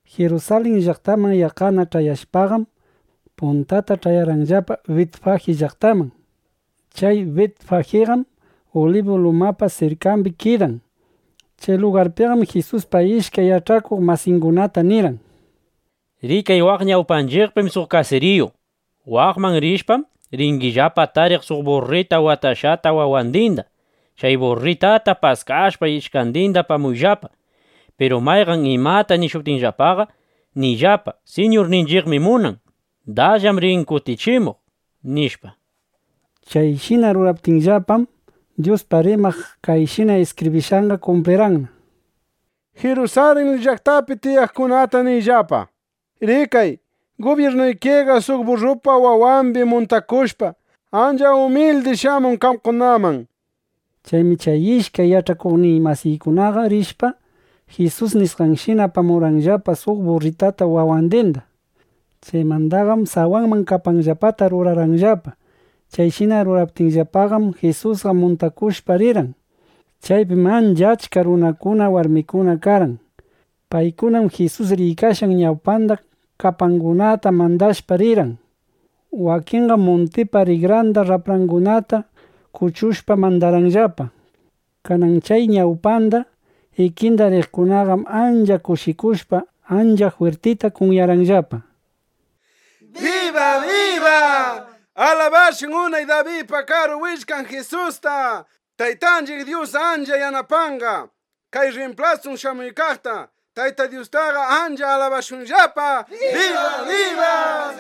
Jirusalin llaqtaman yaqqana ch'ayashpaqam, puntata ch'ayarqayllapa Bitfaji llaqtitaman. Chay Bitfajiqam Ulibu lumapa sirkambi kidan. Chay lugarpiqam Jisusqa ishkay yach'akuq masiykunata nirqan: —Rikay, waq ñawpanchiqpim suq kasiriyu. Waqman rishpam, ringillapa tariq suq burra watashqata wawandinda. Chay burrata paskashpa, ishkandinda apamuyllapa. Piru mayqan imata nishuptinllapaqa, niyllapa: “Siñurninchiqmi munan. Dasllam rin kutichimuq”, nishpa. Chayshina ruraptinllapam, Dyuspaq rimaq kayshina iskibrishqanqa kumplirqanna: Jirusalin llaqtapi tiyaqkunata niyllapa: “Rikay, gubyirnuykiqa suq burrapa wawambi muntakushpa, ancha umildi shamun qamkunaman”, nishpa. Chaymi chay ishkay yach'akuqnin masiykunaqa rishpa, Jisus nishqanshina apamurqanllapa suq burrata wawandinda. Chaymandaqam sawanman kapanllapata rurarqanllapa. Chayshina ruraptinllapaqam, Jisusqa muntakushpana rirqan. Chaypim ancha achka runakuna, warmikuna karqan. Paykunam Jisus riykashqan ñawpanda kapangunata mandashpa rirqan. Wakinqam muntipa rikran raprayuqkunata kuchushpa, mandarqanllapa. Kanan chay ñawpanda, ikinda riqkunaqam ancha kushikushpa, ancha jwirtita kunyarqanllapa: —¡Biba, biba! ¡Alabashun unay Dabidpa Karu Willkan Jisusta! ¡Taytanchiq Dyus ancha yanapanqa kay rrimplasun shamuykaqta! ¡Tayta Dyustaqa ancha alabashunllapa! nishpa.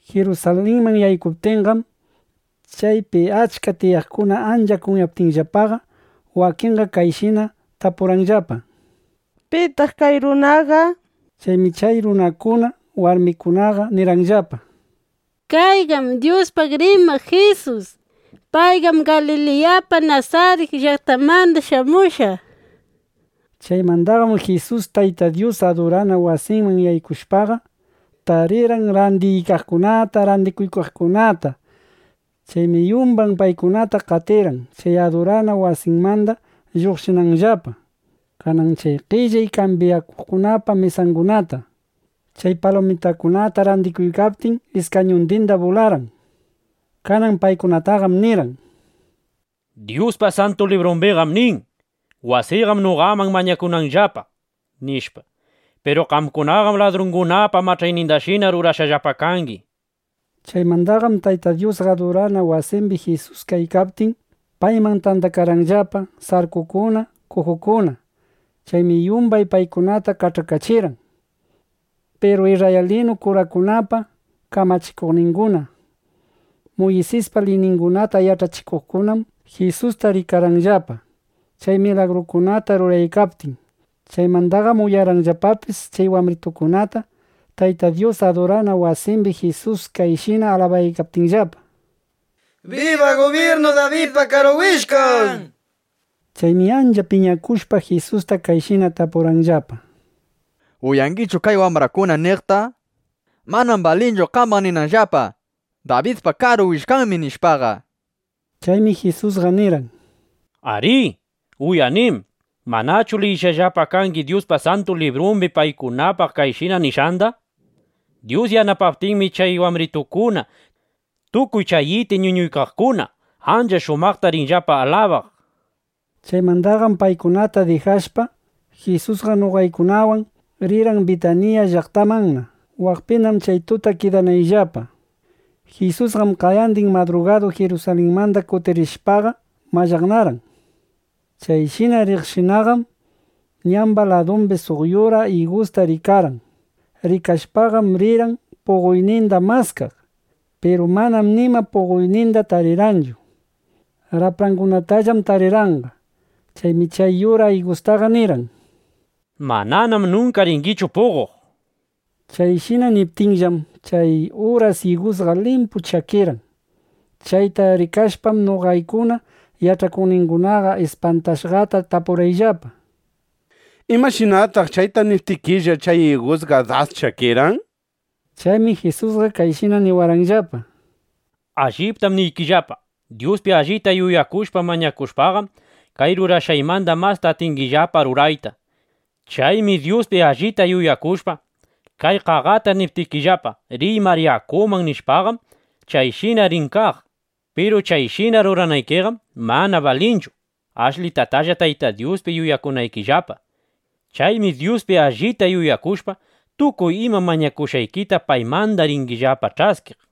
Jirusalinman yaykuptinqam, chaypi achka tiyaqkuna ancha kunyaptinllapaqa, wakinqa kayshina tapurqanllapa: —¿Pitaq kay runaqa? nishpa. Chaymi chay runakuna, warmikunaqa nirqanllapa: —Kayqam Dyuspaq rimaq Jisus. Payqam Galiliyapa Nasarit llaqtanmanda shamushqa, nishpa. Chaymandaqam Jisus Tayta Dyuspa adurana wasinman yaykushpaqa, (patyumbi) tarirqan randiykaqkunata randikuykaqkunata. Chaymi yumbay paykunata qatirqan, chay adurana wasimanda lluqshinanllapa. Kanan chay qellay kambyaqkunapa mesangunata, chay palumitakunata randikuqkunapa iskañundindam bularqan. Kanan paykunataqam nirqan: —Dyuspa Santu Librumbiqam nin: “Wasiyqam noqaman mañakunanllapa”, nishpa. Piru qamkunaqam ladrungunapa mach'aynindashina rurashqallapa kangi, nishpa. Chaymandaqam Tayta Dyuspa adurana wasimbi Jisus kaykaptin, payman tandakarqanllapa sarkukuna, kujukuna. Chaymi yumbay paykunata kach'akachirqan. Piru isrraylinu kurakunapa kamachikuqninguna, Muysispa liyningunata yach'achikuqkunam Jisusta rikarqanllapa, chay milagrukunata ruraykaptin. Chaymandaqam uyarqanllapapis chay wambritukunata, Tayta Dyuspa adurana wasimbi Jisusta kayshina alabaptinllapa: “¡Biba gubyirnu Dabidpa Karu Willkan!” nishpa. Chaymi ancha piñakushpa, Jisusta kayshina tapurqanllapa: —¿Uyangichu kay wambrakuna niqta? (Manam balinchu qambaq ninanllapa: “Dabidpa Karu Willkanmi”, nishpaqa.) Chaymi Jisusqa nirqan: —Arí, uyanim. ¿Manachu liyishqallapa kangi Dyuspa Santu Librumbi paykunapaq kayshina nishqanda? Dyus yanapaptinmi, chay wambritukuna tukuy chay iti ñuñuykaqkuna ancha shumaqta rinllapa alabaq, nishpaqa. Chaymandaqam paykunata dijashpana, Jisusqa noqaykunawan rirqan Bitanilla (Bitaniya) llaqtamanna, waqpina chay tuta kidanayllapa. Jisusqam qayandin madrugadu Jirusalinman kutiriykashpaqa mallaqnarqan. Chayshina riqshinaqam, ñamba ladumbi suq yura igusta rikarqan. Rikashpaqam rirqan puqoyninda maskaq. Piru manam nima puqoyninda tarirqanchu. Raprangunatallam tarirqanqa. Chaymi chay yura igustaqa nirqan: —¡Mananam nunka ringichu puqoq! nishpa. Chayshina niptinllam, chay uras igusqa limpu chakirqan. Chayta rikashpam, noqaykuna yach'akuqningunaqa ispantashqata tapurqayllapa: —¿Imashinataq chayta niptikilla, chay igusqa das chakirqan? nishpa. Chaymi Jisusqa kayshina niwarqanllapa: —Alliptam niykillapa, Dyuspi allita yuyakushpa mañakushpaqam, kay rurashqaymanda masta atingillapa rurayta. Chaymi Dyuspi allita yuyakushpa, kay qaqata niptikillapa, “Riy mar yakuman”, nishpaqam, chayshina rin kaq. Piru chayshina ruranaykiqam mana balinchu ashlitatalla Tayta Dyuspi yuyakunaykillapa. Chaymi Dyuspi allita yuyakushpa, tukuy ima mañakushqaykita paymanda ringillapa ch'askiq.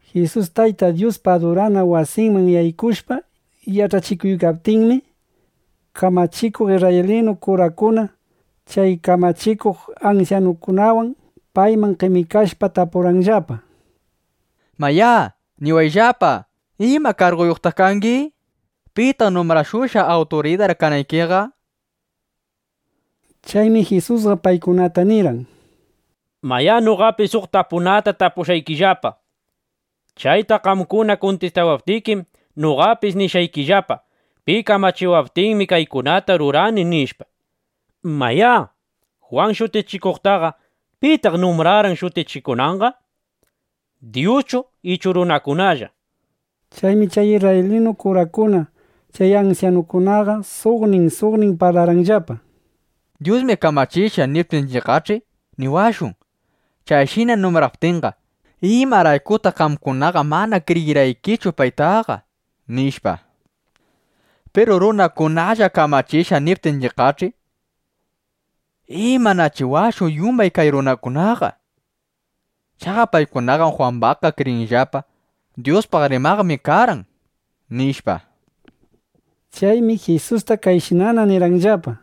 Jisus Tayta Dyuspa adurana wasinman yaykushpa yach'achikuykaptinmi, kamachikuq isrraylinu kurakuna, chay kamachikuq ansyanukunawan payman qemikashpa, tapurqanllapa: —Mayá, niwayllapa. ¿Ima karguyuqtaq kangi? ¿Pitaq numbrashushqa, awturidar kanaykiqa? nishpa. Chaymi Jisusqa paykunata nirqan: —Mayá, noqapis suq tapunata tapushqaykillapa. Chayta qamkuna kuntistawaptikim, noqapis nishqaykillapa: Pi kamachiwaptinmi, kaykunata rurani, nishpa. Mayá, Jwan Shutichikuqtaqa ¿pitaq numbrarqan, shutichikunanqa? ¿Dyuschu ichu runakunalla? Chaymi chay isrraylinu kurakuna, chay ansyanukunaqa suqnin suqnin parlarqanllapa: —Dyusmi kamachishqa, niptinchiqqach'i, niwashun: “Chayshina numbraptinqa, ¿imaraykutaq qamkuna mana kriyirqaykichu paytaqa?” nishpa. Piru “runakunallam kamachishqa” niptinchiqqach'i, ¿imanachiwashun yumbay kay runakunaqa? Chaqa paykunaqam Jwambaqqa kriyinllapa, Dyuspaq rimaqmi karqan, nishpa. Chaymi Jisusta kayshinana nirqanllapa: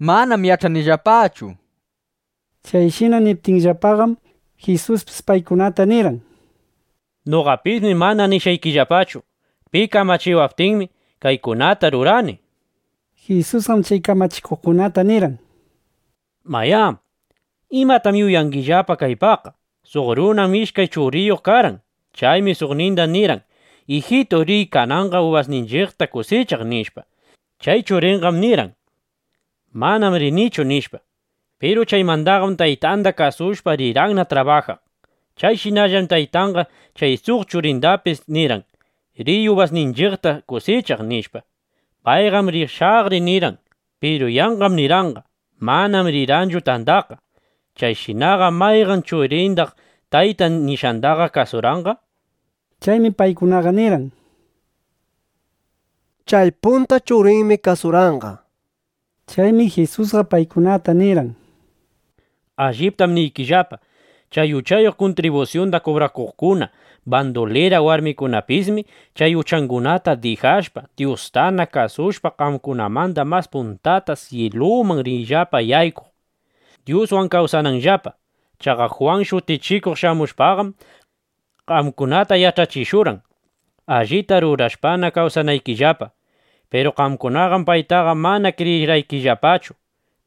—Manam yach'anillapachu, nishpa. Chayshina niptinllapaqam, Jisuspis paykunata nirqan: —Noqapismi mana nishqaykillapachu pi kamachiwaptinmi, kaykunata rurani, nishpaqa. Jisusqam chay kamachikuqkunata nirqan: —Mayá, ¿imatam yuyangillapa kaypaqqa? Suq runam ishkay churiyuq karqan. Chaymi suqninda nirqan: “Ijitu, riy kananqa ubasninchiqta kusichaq”, nishpa. Chay churinqam nirqan: “Manam rinichu”, nishpa. Piru chaymandaqam taytanda kasushpa, rirqanna trabajaq. Chayshinallam taytanqa chay suq churindapis nirqan: “Riy ubasninchiqta kusichaq”, nishpa. Payqam, “Rishaqri” nirqan. Piru yanqam nirqanqa. Manam rirqanchu tandaqqa. Chayshinaqa ¿mayqan churindaq taytan nishqandaqa kasurqan? nishpa. Chaymi paykunaqa nirqan: —Chay punta churinmi kasurqanqa, nishpa. Chaymi Jisusqa paykunata nirqan: —Alliptam niykillapa, chay uchayuq kuntribusyunda kubrakuqkuna, bandulira warmikunapismi chay uchangunata dijashpa, Dyustana kasushpa, qamkunamanda mas puntata syiluman rinllapa yaykuq, Dyuswan kawsananllapa. Chaqa Jwan Shutichikuq shamushpaqam, qamkunata yach'achishurqan, allita rurashpana kawsanaykillapa. Piru qamkunaqam paytaqa mana kriyirqaykillapachu.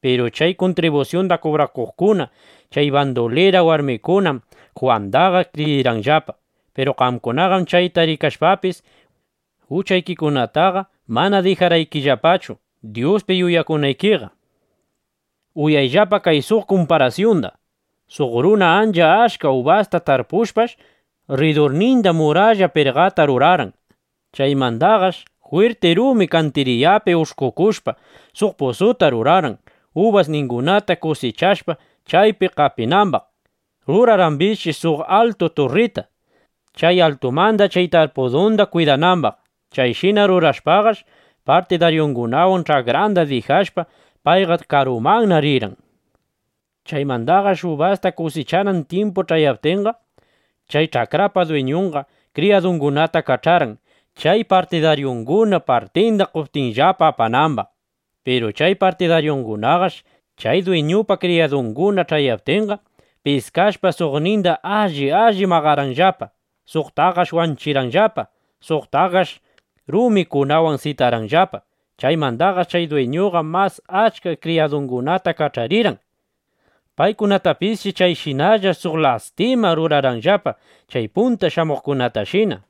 Piru chay kuntribusyunda kubrakuqkuna, chay bandulira warmikunam Jwandaqa kriyirqanllapa. Piru qamkunaqam chayta rikashpapis, uchaykikunataqa mana dijarqaykillapachu, Dyuspi yuyakunaykiqa. ’Uyayllapa kay suq kumparasyunda: Suq runa ancha achka ubasta tarpushpash, rridurninda muralla pirqata rurarqan. Chaymandaqash jwirti rumi kantiriyapi ush'kukushpa, suq pusuta rurarqan, ubasningunata kusichashpa, chaypi qapinambaq. Rurarqambisshi suq altu turrita, chay altumanda chay tarpudunda kwidanambaq. Chayshina rurashpaqash, partidaryungunawan ch'akranda dijashpa, payqa karumanna rirqan. Chaymandaqash ubasta kusichanan tyimpu ch'ayaptinqa, chay ch'akrapa dwiñunqa kriyadungunata kach'arqan, chay partidaryunguna partinda qoptinllapa apanambaq. Piru chay partidaryungunaqash, chay dwiñupa kriyadunguna ch'ayaptinqa, piskashpa, suqninda alli alli maqarqanllapa; suqtaqash wanchirqanllapa; suqtaqash rumikunawan sitarqanllapa. Chaymandaqash chay dwiñuqa mas achka kriyadungunata kach'arirqan. Paykunatapisshi chayshinalla suq lastima rurarqanllapa chay punta shamuqkunatashina.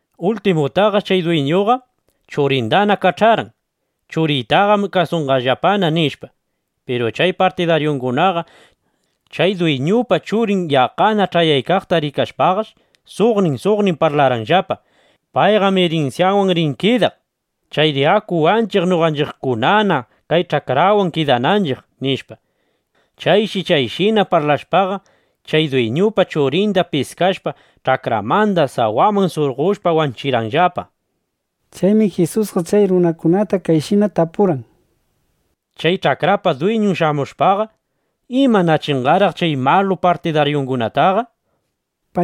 ’Ultimutaqash chay dwiñuqa churindana kach'arqan: “Churiytaqam kasunqallapana”, nishpa. Piru chay partidaryungunaqa chay dwiñupa churin yaqqana ch'ayaqta rikashpaqash suqnin suqnin parlarqanllapa: “Payqam irinsyawan rin kidaq. Chayri aku wanchiq, noqanchiqkunana kay ch'akranwan kidananchiq”, nishpa. Chayshi chayshina parlashpaqa, chay dwiñupa churinda piskashpa, ch'akranmanda sawaman surqoshpa, wanchirqanllapa. Chaymi Jisusqa chay runakunata kayshina tapurqan: —Chay ch'akrapa dwiñun shamushpaqa, ¿imanachinqaraq chay malu partidaryungunataqa? nishpa.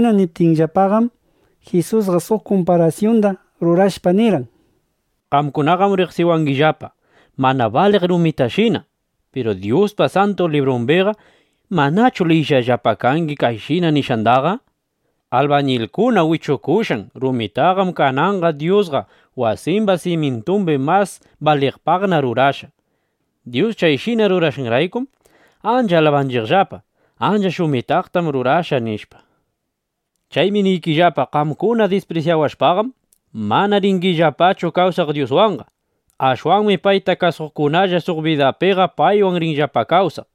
Chayshina niptinllapaqam, Jisusqa suq kumparasyunda rurashpa, nirqan: —Qamkunaqam riqsiwangillapa mana baliq rumitashina. Piru Dyuspa Santu Librumbiqa ¿manachu liyishqallapa kangi kayshina nishqandaqa? Albañilkuna wichukushqan rumitaqam kananqa Dyusqa wasimba simyintumbi mas baliqpaqna rurashqa. Dyus chayshina rurashqanraykum ancha alabanchiqllapa: “Ancha shumitaqtam rurashqa”, nishpa. Chaymi niykillapa, qamkuna disprisyawashpam, manana ringillapachu kawsaq Dyuswanqa. Ashwanmi payta kasuqkunalla suq bidapiqa paywan rinllapa kawsaq. ˻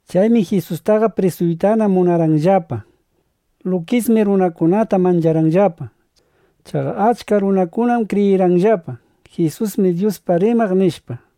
Chaymi Jisustaqa prisuytana munarqanllapa. Lukismi runakunata mancharqanllapa. Chaqa achka runam kriyirqanllapa: Jisusmi Dyuspaq rimaq, nishpa.